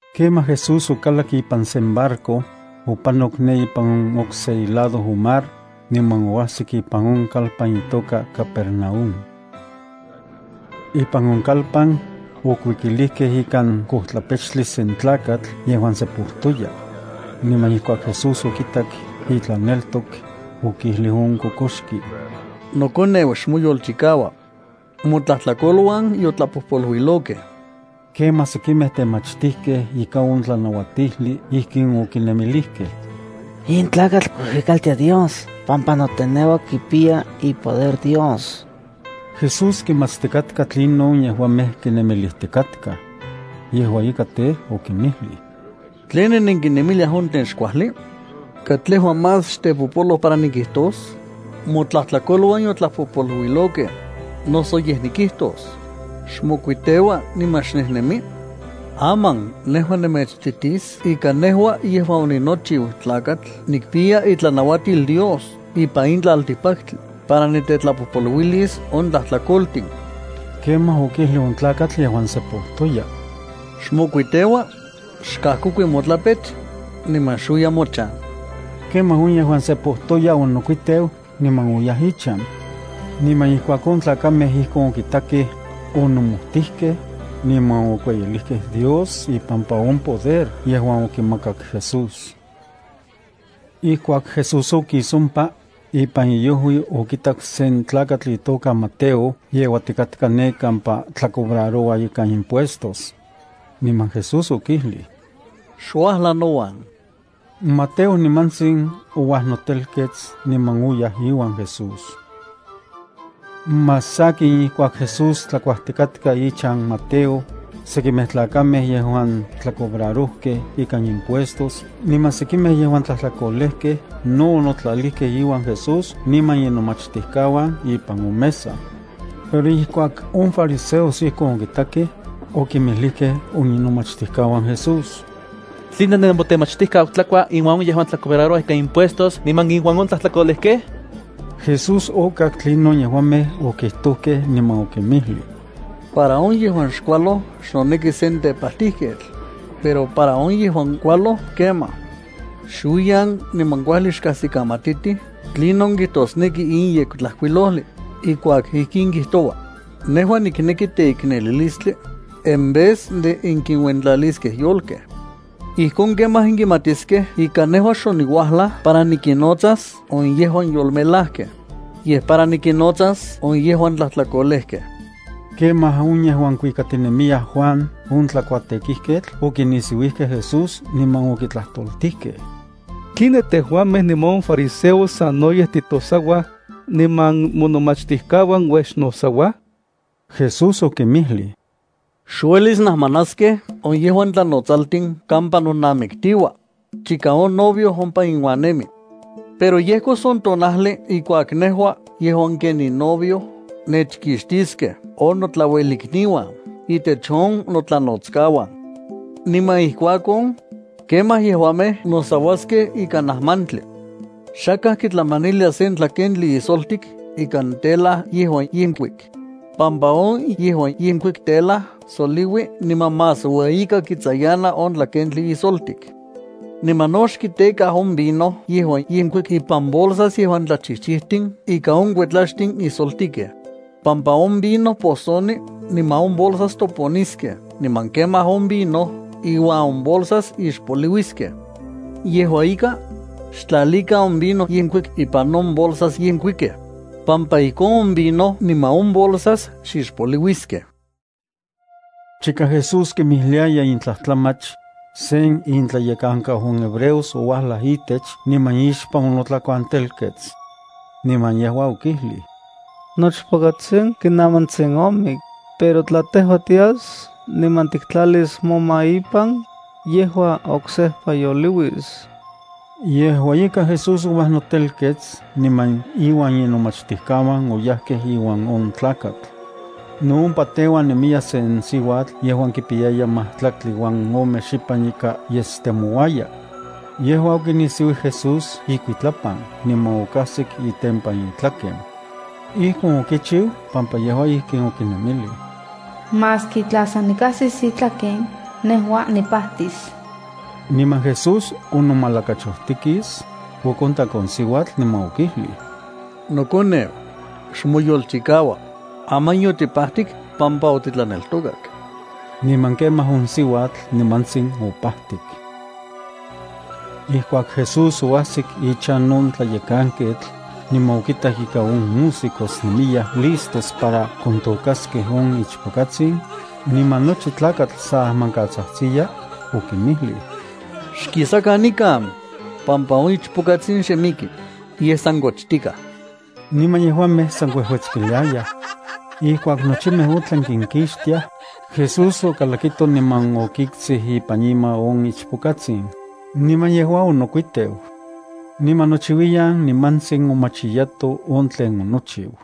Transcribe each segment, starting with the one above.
Kemaj Jesús okalak ipan sen barco, opanok ne ipan okse ilado on mar, niman oajsik ipan on kalpan itoka Capernaúm. Ipan on kalpan, okuikilijkej ikan kojtlapechtli sen tlakatl yejuan sepojtoya. Niman ijkuak Jesús okitak intlaneltok, okijlij on kokoxki: —Nokoneu, xmoyolchikaua. Motlajtlakoluan yotlapojpoluilokej. Kemaj sekimej temachtijkej ika on tlanauatijli ijkin okinemilijkej: “In tlakatl kuijuikaltia Dios pampa noteneua kipiya ipoder Dios.” Jesús kimatstikatka tlinon yejuamej kinemilijtikatkaj. Yejua ika tej, okinmijlij: —¿Tline nenkinemiliaj on tlen xkuajli? ¿Katlejua más xtepopoloj para nejua nikijtos: “Motlajtlakoluan yotlapojpoluilokej”, noso yej nikijtos: “Xmokuiteua niman xnejnemi”? Aman, nejua nemechititis ika nejua yejuan oninochiu Tlakatl nikpiya itlanauatil Dios ipan in tlaltikpaktli para nitetlapojpoluilis on tlajtlakoltin. Kemaj okijlij on tlakatl yejuan sepojtoya: —Xmokuiteua, xkajkokui motlapech, niman xuiya mochan. Kemaj on yejuan sepojtoya onokuiteu niman oyaj ichan. Niman ijkuak on tlakamej ijkon okitakej, onomojtijkej, niman okueyilijkej Dios ipampa on poder yejuan okimakak Jesús. Ijkuak Jesús okis ompa, ipan iojui okitak sen tlakatl itoka Mateo yeuatikatka ne kampa tlacobraroua ikan impuestos. Niman Jesús okijlij: —Xuajla nouan. Mateo nimantsin ouajnotelkets niman oyaj iuan Jesús. Más sakin, ijkuak Jesús tlakuajtikatka ichan Mateo, sekimej tlakamej yejuan tlacobrarojkej ikan impuestos niman sekimej yejuan tlajtlakolejkej no onotlalijkej iuan Jesús niman inomachtijkauan ipan on mesa. Pero ijkuak on fariseos ijkon okitakej, okinmijlijkej on inomachtijkauan Jesús: —¿Tline nemotemachtijkau tlakua inuan on yejuan tlacobrarouaj ika impuestos niman inuan on tlajtlakolejkej? Jesús okak tlinon yejuamej okijtojkej, niman okinmijlij: —Para on yejuan xkualoj xnoneki sen tepajtijketl, pero para on yejuan kualoj kemaj. Xuiyan niman kuajli xkajsikamatitij tlinon kijtosneki in Yektlajkuilojli ijkuak ijkin kijtoua: “Nejua nikneki teiknelilistli en vez de nenkinuentlaliskej yolkej.” Ijkon kemaj nenkimatiskej ika nejua xoniuajlaj para nikinnotsas on yejuan yolmelajkej, yej para nikinnotsas on yejuan tlajtlakolejkej. Kemaj on yejuan kuikatinemiyaj Juan on tlakuatekijketl okinisiuijkej Jesús, niman okitlajtoltijkej: —¿Tline tejuamej niman on fariseos sanoyej titosauaj, niman monomachtijkauan uej xnosauaj? Jesús okinmijlij: —Xuelis najmanaskej on yejuan tlanotsaltin kampa nonamiktiua, chika on novio ompa inuan nemi. Pero yejkos on tonajli ijkuak nejua yejuan ken ninovio nechkixtiskej on notlauelikniuan intech on notlanotskauan. Niman ijkuakon, kemaj yejuamej nosauaskej ikan ajmantli. ’Xakaj kitlamanilia sen tlakentli ijsoltik ikan tela yejuan yenkuik, pampa on yejuan yenkuik telaj tsoliui niman más ueyika kitsayana on tlakentli ijsoltik. Niman no xkitekaj on vino yejuan yenkuik ipan bolsas yejuan tlachijchijtin ikan on kuetlaxtin ijsoltikej, pampa on vino posoni niman on bolsas toponiskej niman kemaj on vino iuan on bolsas ixpoliuiskej. Yejua ika, xtlalikan on vino yenkuik ipan on bolsas yenkuikej, pampa ijkon on vino niman on bolsas xixpoliuiskej. Chika Jesús kinmijliaya in tlajtlamach, sen intlayekankau on hebreos ouajlaj itech niman ixpan onotlakuantelkets. Niman yejua okijlij: —Nochpokatsin kinamantsin omik, pero tla tejua tias niman tiktlalis moma ipan, yejua oksejpa yoliuis. Yejua ika Jesús ouanotelkets niman iuan inomachtijkauan oyajkej iuan on tlakatl. No ompa teuan nemiya sen siuatl yejuan kipiyaya majtlaktli uan ome xipan ika yesuetstinemiya. Yejua okinisiuij Jesús ikuitlapan niman okajsik itempan itlaken. Ijkon okichiu pampa yejua ijkin okinemilij: “Maski tla san nikajsis itlaken, nejua nipajtis.” Niman Jesús onomalakachojtikis, okontak on siuatl, niman okijlij: —¡Nokoneu, xmoyolchikaua! Aman yotipajtik pampa otitlaneltokak. Niman kemaj on siuatl nimantsin opajtik. Ijkuak Jesús oajsik ichan on tlayekanketl, niman okitak ika on músicos nemiyaj listos para kontokaskej on ichpokatsin, niman nochi tlakatl sa ajmankatsajtsiya, okinmijlij: —Xkisakan nikan, pampa on ichpokatsin xe miki, yej san kochtikaj. Niman yejuamej san kuejuetskiliayaj. Ijkuak nochimej otlan kinkixtiaj, Jesús okalakito niman okiktsij ipan ima on ichpokatsin, niman yejua onokuiteu. Niman nochiuiyan nimantsin omachiyato on tlen onochiu.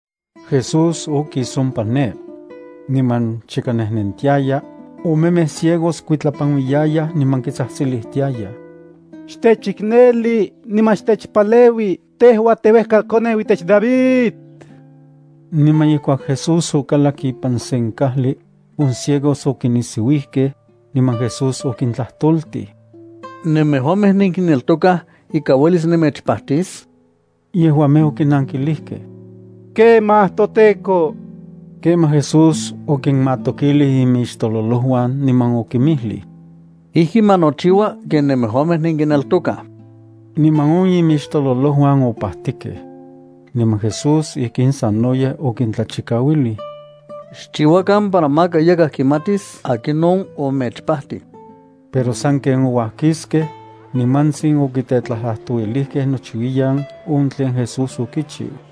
Jesús okis ompa ne. Niman chika nejnentiaya, omemej ciegos kuitlapanuiyayaj, niman kitsajtsilijtiayaj: —¡Xtechikneli niman xtechpaleui tejua teuejkakoneu itech David! Niman ijkuak Jesús okalak ipan sen kajli, on ciegos okinisiuijkej, niman Jesús okintlajtoltij: —¿Nemejuamej nenkineltokaj ika uelis nemechpajtis? Yejuamej okinankijlijkej: —Kemaj, toTEKO. Kemaj Jesús okinmatokilij imixtololojuan niman okinmijlij: —Ijki ma nochiua ken nemejuamej nenkineltokaj. Niman on imixtololojuan opajtikej. Niman Jesús ijkin sanoyej okintlachikauilij: —Xchiuakan para maka yakaj kimatis akinon omechpajtij. Pero sanken ouajkiskej, nimantsin okitetlajtlajtouilijkej nochiuiyan on tlen Jesús okichiu.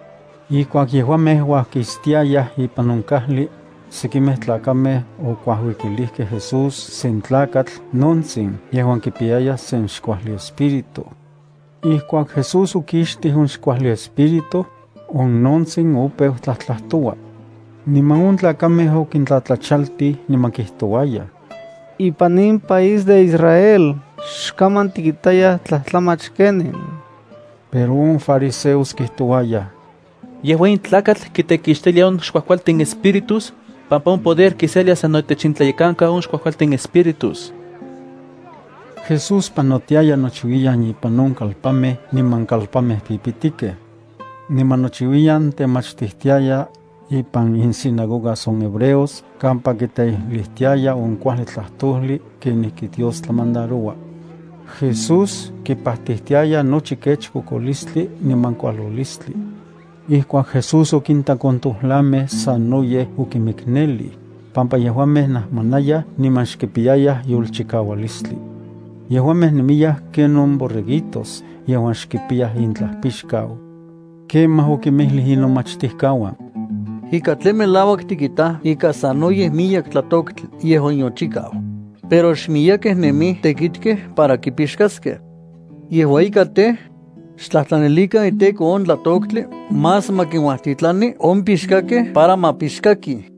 Ijkuak yejuamej uajkistiayaj ipan on kajli, sekimej tlakamej okuajuikilijkej Jesús sen tlakatl nontsin yejuan kipiyaya sen xkuajli espíritu. Ijkuak Jesús okixtij on xkuajli espíritu, on nontsin opeu tlajtlajtoua. Niman on tlakamej okintlatlachaltij. Niman kijtouayaj: —Ipan in país de Israel xkaman tikitayaj tlajtlamach kenin. Pero on fariseos kijtouayaj: —Yejua in tlakatl kitekixtilia on xkuajkualtin espíritus, pampa on poder kiselia sano itech intlayekankau on xkuajkualtin espíritus. Jesús panotiaya nochiuiyan ipan on kalpanmej niman kalpanmej pipitikej. Niman nochiuiyan temachtijtiaya ipan insinagogas on hebreos kampa kiteijlijtiaya on kuajli tlajtojli kenijki Dios tlamandaroua. Jesús kipajtijtiaya nochi kech kokolistli niman kualolistli. Ijkuak Jesús okintak on tojlamej, sanoyej okimiknelij, pampa yejuamej najmanayaj niman xkipiyayaj yolchikaualistli. Yejuamej nemiyaj ken on borreguitos yejuan xkipiyaj intlajpixkau. Kemaj okinmijlij inomachtijkauan: —Ika tlen melauak tikitaj ika sanoyej miyek tlatoktli yejuan yochikau, pero xmiyekej nemij tekitkej para kipixkaskej. Yejua ika tej, xtlajtlanilikan iTEKO on tlatoktli más ma kinuajtitlani on pixkakej para ma pixkakij.